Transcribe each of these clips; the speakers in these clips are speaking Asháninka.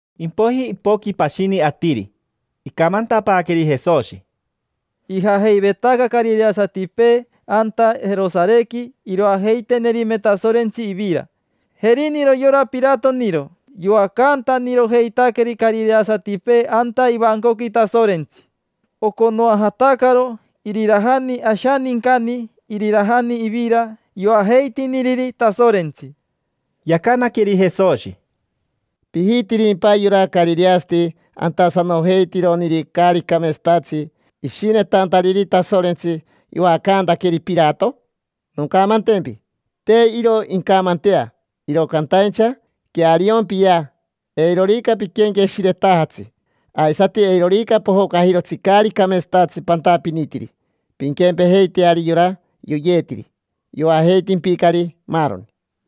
Impoiji ipoqui pashini atiri, icamantapaaqueri Jesoshi: —Ijajeivetaca carireasatipee anta Jerosarequi iroajeitenerime Tasorentsi ivira. Jeriniro yora Piratoniro yoacantanirojeitaqueri carireasatipee anta ivancoqui Tasorentsi. Oconoajatacaro irirajani ashanincani irirajani ivira yoajeitiniriri Tasorentsi. Yacanaqueri Jesoshi: —¿Pijitirimpa yora carireasati antasanojeitironiri caari cameetsatatsi ishinetantariri Tasorentsi yoacantaqueri Pirato? Noncamantempi: te iro incamantea. Iro cantaincha queariompiyea: eirorica piquenqueshiretajatsi, aisati eirorica pojocajirotsi caari cameetsatatsi pantapinitiri, pinquempejeiteari yora yoyeetiri. Yoajeitimpicari, maaroni.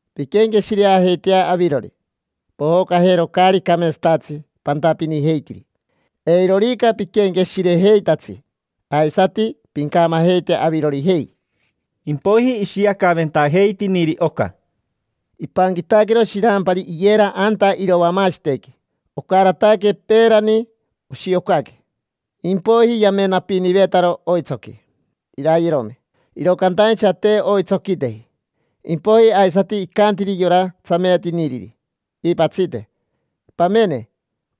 Pinquenqueshireajeitea avirori, pojocajero caari cameetsatatsi pantapinijeitiri. Eirorica piquenqueshirejeitatsi, aisati pincamajeite avirorijei. Impoiji ishiacaventajeitiniri oca: —Ipanquitaquero shirampari iyera anta irovamashitequi. Ocarataque peerani oshiocaque, impoiji yamenapinivetaro oitsoqui, irayerome: iro cantaincha te oitsoquiteji. Impoiji aisati icantiri yora tsameetiniriri iipatsite: “Pamene,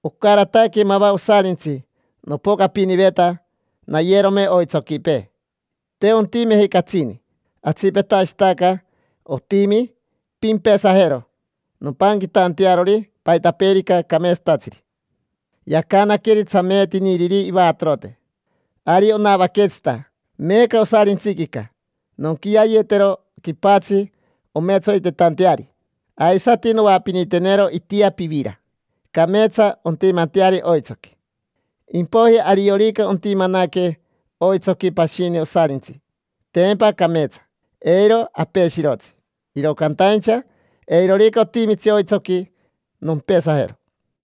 ocarataque mava osarintsi nopocapiniveta nayerome oitsoquipee. Te ontimeji catsini. Atsipetashitaca otimi. Pimpesajero nompanquitantearori paitapeerica cameetsatatsiri”. Yacanaqueri tsameetiniriri ivatorote: “Ari onavaquetsita meeca osarintsiquica. Nonquiayetero quipatsi ometsoitetanteari, aisati noapinitenero itia pivira, cameetsa ontimanteari oitsoqui. Impoiji ariorica ontimanaque oitsoqui pashini osarintsi, tempa cameetsa, eiro apeshirotsi. Iro cantaincha eirorica otimitsi oitsoqui, nompesajero”.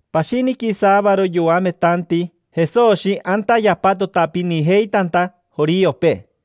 Pashiniqui saavaro yoametanti Jesoshi anta yapatotapinijeitanta joriopee.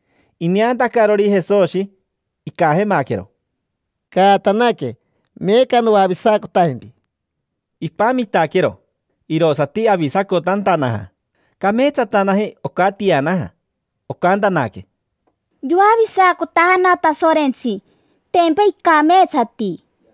Ineantacarori Jesoshi, icajemaquero: —Caatanaque, meeca noavisacotajempi. Ipamitaquero, irosati avisacotantanaja. Cameetsatanaji, ocatianaja. Ocantanaque: —Yoavisacotajana Tasorentsi, tempa icameetsati.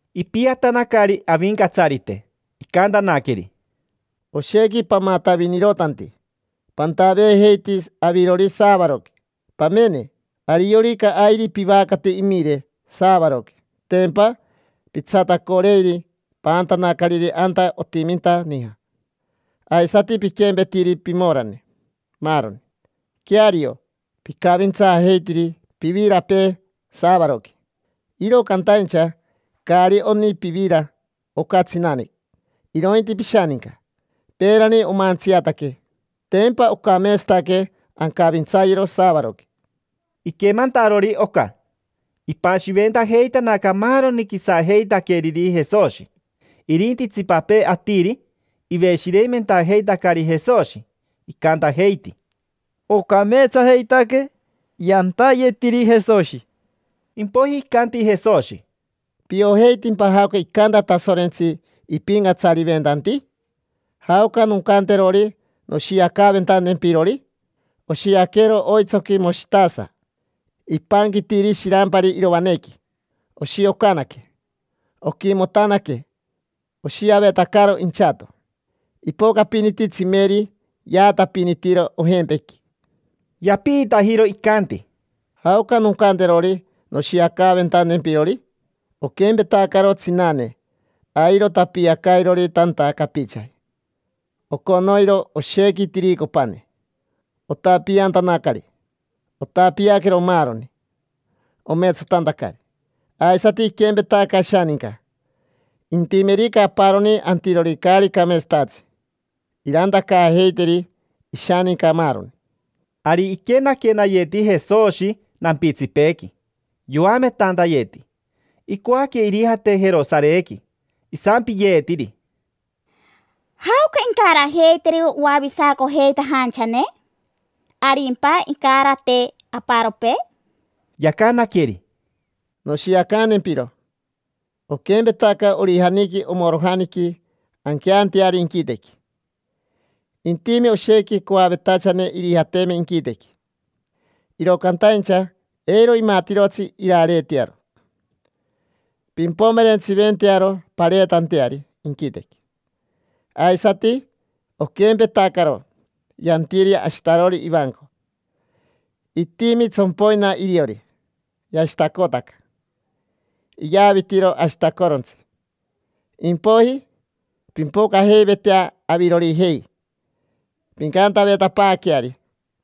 Ipiatanacari Avincatsarite, icantanaqueri: —Oshequi pamatavinirotanti. Pantaveejeiti avirori saavaroqui. Pamene, ariorica airi pivacate imire saavaroqui, tempa pitsatacoreiri paantanacariri anta otiminta nija. Aisati piquempetiri pimorane, maaroni. Queario, picavintsaajeitiri pivirapee saavaroqui. Iro cantaincha caari oni pivira oca tsinane, irointi pishaninca. Peerani omantsiataque: tempa ocameetsataque ancavintsayero saavaroqui. Iquemantarori oca, ipashiventajeitanaca maaroni quisajeitaqueriri Jesoshi. Irinti itsipapee atiri iveshireimentajeitacari Jesoshi, icantajeiti: —Ocameetsajeitaque yantayetiri Jesoshi. Impoiji icanti Jesoshi: —¿Piojeitimpa jaoca icanta Tasorentsi ipincatsariventanti? ¿Jaoca noncanterori noshiacaaventantempirori? Oshiaquero oitsoqui moshitasa ipanquitiri shirampari iroanequi. Oshiocanaque, oquimotanaque, oshiavetacaro inchato. Ipocapiniti tsimeri, yaatapinitiro ojempequi. Yapiitajiro, icanti: —¿Jaoca noncanterori noshiacaaventantempirori? Oquempetacaro tsinane, airo tapiacairori tanta capichaji. Oconoiro oshequi tiricopane otapiantanacari. Otapiaquero maaroni, ometsotantacari. Aisati iquempetaca ashaninca. Intimerica aparoni antirori caari cameetsatatsi, irantacaajeiteri ishaninca, maaroni. Ari iquenaquenayeti Jesoshi nampitsipeequi, yoametantayeti. Icoaque irijate Jerosarequi. Isampiyeetiri: —¿Jaoca incarajeiteri oavisacojeitajanchane? ¿Arimpa incarate aparopee? Yacanaqueri: —Noshiacantempiro. Oquempetaca orijaniqui omorojaniqui anqueanteari inquitequi. Intime oshequi coavetachane irijateme inquitequi, iro cantaincha eiro imatirotsi irareetearo. Pimpomerentsiventearo pareetanteari inquitequi. Aisati oquempetacaro yantiri ashitarori ivanco. Itimi tsompoina iriori, yashitacotaca, iyavitiro ashitacorontsi. Impoiji pimpocajeivetea avirorijei, pincantavetapaaqueari: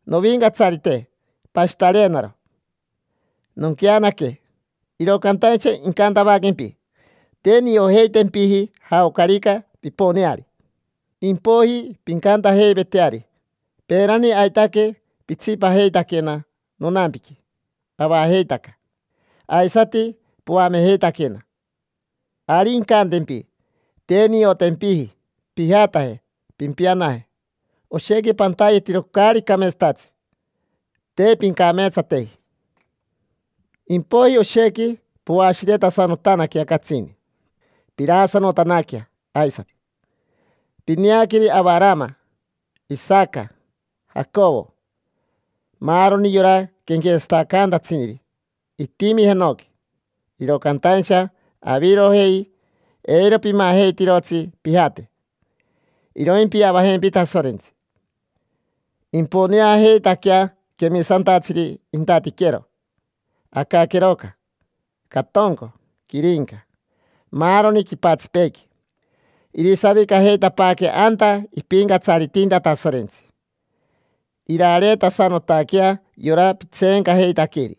“Novincatsarite, pashitareenaro, nonqueanaque”. Iro cantaincha incantavaquempi: “Te niojeitempiji jaocarica piponeari”. Impoiji pincantajeiveteari: “Peerani aitaque pitsipajeitaquena nonampiqui avajeitaca, aisati poamejeitaquena”. Ari incantempi: “Te niotempiji. Pijataje, pimpianaje. Oshequi pantayetiro caari cameetsatatsi. Te pincameetsateji”. Impoiji oshequi poashiretasanotanaquea catsini, piraasanotanaquea aisati. Pineaqueri Avarama, Isaca, Jacovo, maaroni yora quenquetsatacantatsiniri itimi jenoqui, iro cantaincha avirojei, eiro pimajeitirotsi pijate: iroimpiavajempi Tasorentsi. Imponeajeitaquea quemisantatsiri intatiquero, acaqueroca, catonco, quirinca, maaroni quipatsipeequi. Irisavicajeitapaaque anta ipincatsaritinta Tasorentsi. Irareetasanotaquea yora pitseencajeitaqueri.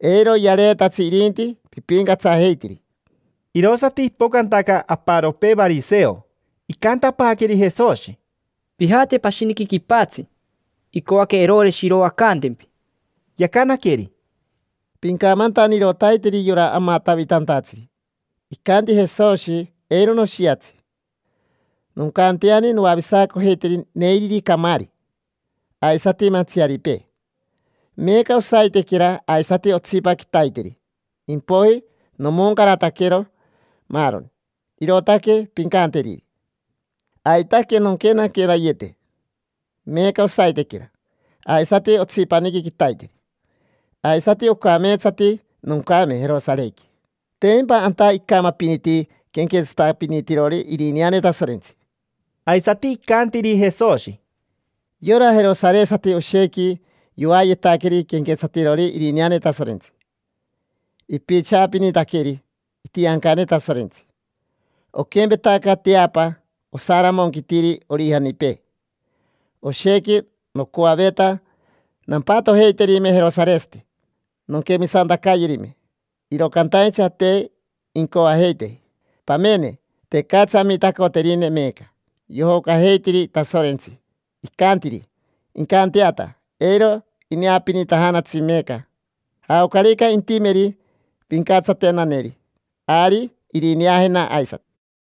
Eiro yareetatsi irinti pipincatsajeitiri. Irosati ipocantaca aparopee variseo. Icantapaaqueri Jesoshi: —Pijate pashiniqui quipatsi. Icoaque Eroreshi iroacantempi. Yacanaqueri: —Pincamantanirotaiteri yora amatavitantatsiri: “Icanti Jesoshi: ‘Eiro noshiatsi. Noncanteani noavisacojeiteri neiriri camaari aisati mantsiaripee: meeca, osaitequera, aisati otsipa quitaiteri. Impoiji nomoncarataquero maaroni’”. Irootaque pincanteriri. Aitaque nonquenaquenayete meeca, osaitequera, aisati otsipaniqui quitaiteri. Aisati ocameetsati noncame Jerosarequi: tempa anta icamapiniti quenquetsatapinitirori irineane Tasorentsi. Aisati icantiri Jesoshi: —Yora jerosaresati oshequi yoayetaqueri quenquetsatirori irineane Tasorentsi. Ipichaapinitaqueri itiancane Tasorentsi. Oquempetaca teapa osaramonquitiri orijanipee, oshequi nocoaveta nampatojeiterime jerosaresati: nonquemisantacayerime, iro cantaincha te incoajeiteji. Pamene, tecatsi amitacoterineri meeca, yojocajeitiri Tasorentsi, icantiri: “Incanteata”. Eiro ineapinitajanatsi meeca. Jaocarica intimeri pincatsatenaneri, ari irineajena aisati.